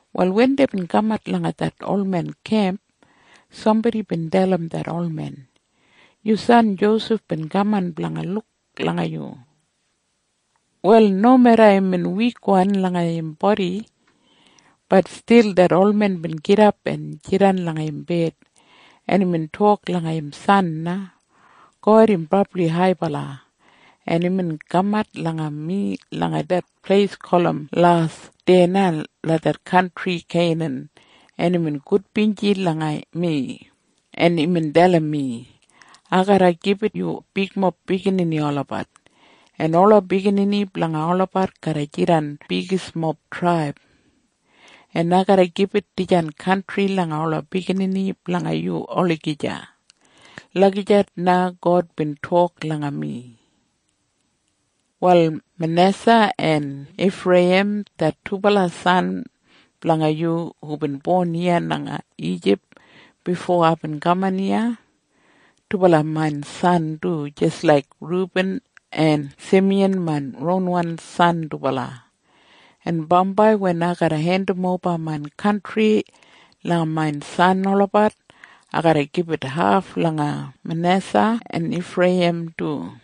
Wal wen deibin kamat langa det olmen kemp, sambodi bin dalim det olmen, “Yu san Josef bin kaman blanga luk langa yu.” Wal nomeda imbin wikwan langa im bodi, bat stil det olmen bin gidap en jidan langa im bed, en imbin tok langa im san na, “God im brabli haibala, en imbin kamat langa mi langa det pleis gulum Las deya langa det kantri Keinan, en imbin gudbinji langa mi, en imbin dalim mi, ‘Ai garra gibit yu bigmob biginini olabat, en ola biginini blanga olabat garra jidan bigismob traib. En ai garra gibit dijan kantri langa ola biginini blanga yu olagija.’ Lagijat na God bin tok langa mi. “Wal Manesa en Ifreiyim det dubala san blanga yu hubin bon iya langa Ijip bifo aibin kaman iya, dubala main san du jis laik Rubin en Simiyan main ronwan san dubala. En bambai wen ai garra hendimoba main kantri langa main san olabat, ai garra gibit haf langa Manesa en Ifreiyim du.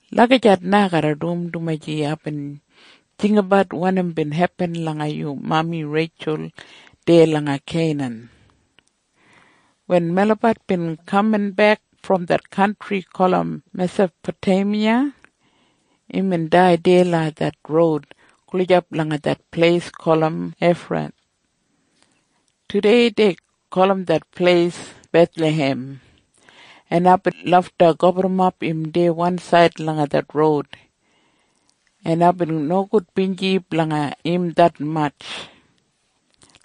Lagijat na ai garra dum, dumaji aibin jinggabat wanim bin hepin langa yu mami Reitjul deya langa Keinan. Wen melabat bin kaminbek brom det kantri gulum Mesapoteimiya, imbin dai deya langa det roud gulijap langa det pleis gulum Efrath. Tudei dei gulum det pleis Bethlahem. En aibin lafta gaburrumap im deya wansaid langa det roud, en aibin nogudbinji blanga im detmatj.”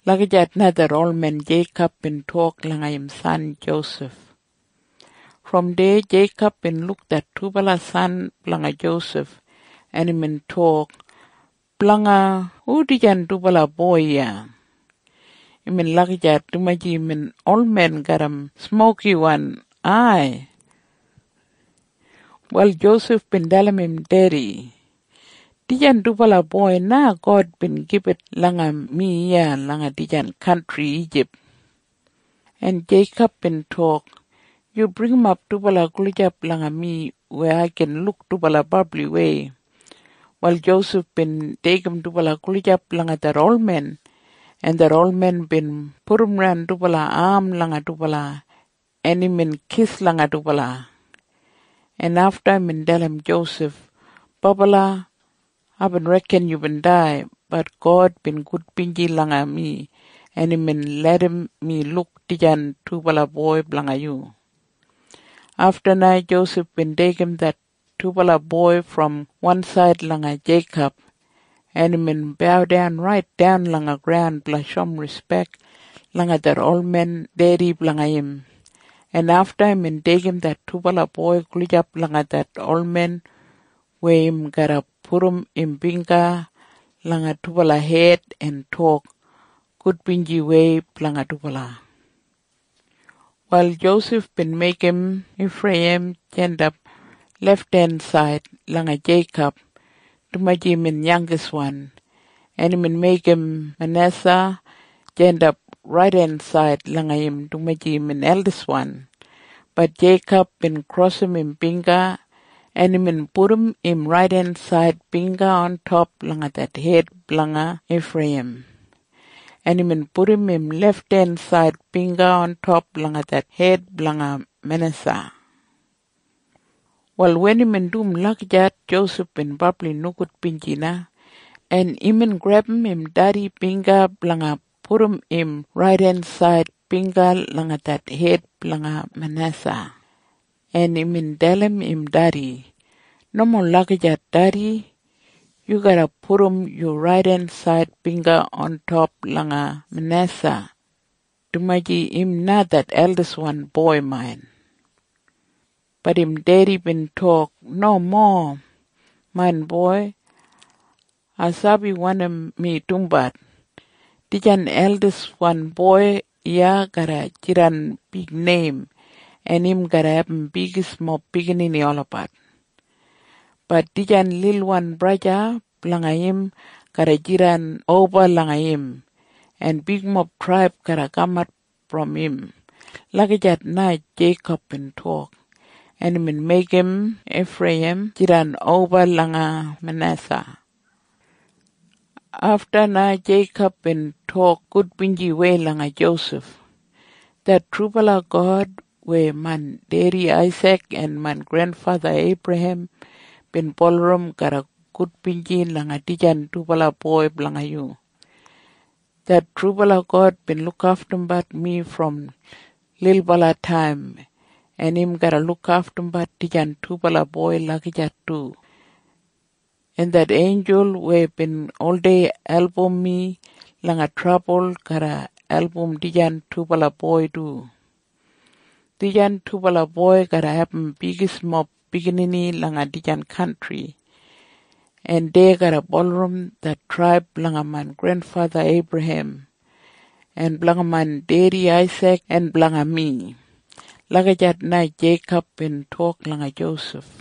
Lagijat na det olmen Jeikob bin tok langa im san Josef. Brom deya Jeikob bin luk det dubala san blanga Josef, en imbin tok, “Blanga hu dijan dubala boi iya?” Imbin lagijat dumaji imbin olmen garram smokiwan ai. Wal Josef bin dalim im dedi, “Dijan dubala boi na God bin gibit langa mi iya langa dijan kantri Ijip.” En Jeikob bin tok, “Yu bringimap dubala gulijap langa mi weya ai gin luk dubala brabliwei.” Wal Josef bin deigim dubala gulijap langa det olmen, en det olmen bin pudumran dubala am langa dubala, en imbin kis langa dubala, en afta imbin dalim Josef, “Bobala, aibin reken yubin dai. Bat God bin gudbinji langa mi, en imbin larram mi luk dijan dubala boi blanga yu.” Afta na Josef bin deigim det dubala boi brom wansaid langa Jeikob, en imbin baudan raitdan langa graun blanga shoum rispek langa det olmen dedi blanga im, en afta imbin deigim det dubala boi gulijap langa det olmen weya im garra pudum im bingga langa dubala hed en tok gudbinjiwei blanga dubala. Wal Josef bin meigim Ifreiyim jandap lefthensaid langa Jeikob, dumaji imbin yangiswan. En imbin meigim Manesa jandap raidensaid langa im dumaji imbin eldiswan. Bat Jeikob bin krosim im bingga, en imbin pudum im raidensaid bingga ontop langa det hed blanga Ifreiyim, en imbin pudum im lefthensaid bingga ontop langa det hed blanga Manesa. Wal wen imbin dum lagijat, Josef bin brabli nogudbinji na, en imbin grebum im dedi bingga blanga pudum im raidensaid bingga langa det hed blanga Manesa, en imbin dalim im dedi, “Nomo lagijat dedi. Yu garra pudum yu raidensaid bingga ontop langa Manesa, dumaji im na det eldiswan boi main.” Bat im dedi bin tok, “Nomo, main boi. Ai sabi wanim mi dumbat. Dijan eldiswan boi iya garra jidan bigneim, en im garra abum bigismob biginini olabat. Bat dijan lilwan braja blanga im garra jidan oba langa im, en bigmob traib garra kamat brom im.” Lagijat na Jeikob bin tok. En imbin meigim Ifreiyim jidan oba langa Manesa. Afta na Jeikob bin tok gudbinjiwei langa Josef, “Det trubala God weya main dedi Aisik en main grenfatha Eibrahem bin bulurrum garra gudbinji langa dijan dubala boi blanga yu. Det trubala God bin lukaftumbat mi brom lilbalataim, en im garra lukaftumbat dijan dubala boi lagijat du. En det einjul weya bin oldei album mi langa trabul garra album dijan dubala boi du. Dijan dubala boi garra abum bigismob biginini langa dijan kantri, en dei garra bulurrum det traib blanga main grenfatha Eibrahem en blanga main dedi Aisik en blanga mi.” Lagijat na Jeikob bin tok langa Josef.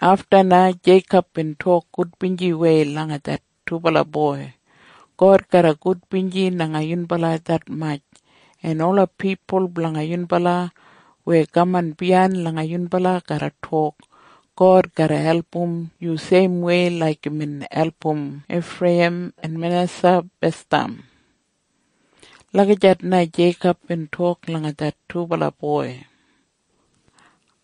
Afta na Jeikob bin tok gudbinjiwei langa det dubala boi, “God garra gudbinji langa yunbala detmatj, en ola pipul blanga yunbala weya kaman biyain langa yunbala garra tok, ‘God garra album yu seimwei laik imbin album Ifreiyim en Manesa basdam.’” Lagijat na Jeikob bin tok langa det dubala boi.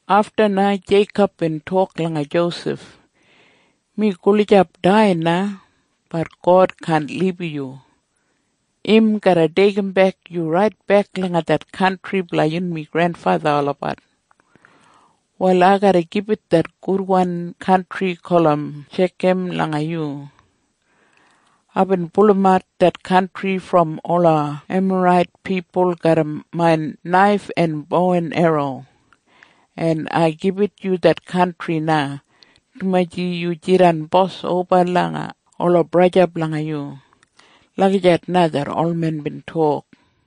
Afta na Jeikob bin tok langa Josef, “Mi gulijap dai na. Bat God kaan libum yu. Im garra deigimbek yu raitbek langa det kantri blanga yunmi grenfatha olabat. “Wal ai garra gibit det gudwan kantri gulum Shekam langa yu. Aibin pulumat det kantri brom ola Emarait pipul garram main naif en bo en erro. En ai gibit yu det kantri na, dumaji yu jidan bos oba langa ola braja blanga yu.” Lagijat na det olmen bin tok.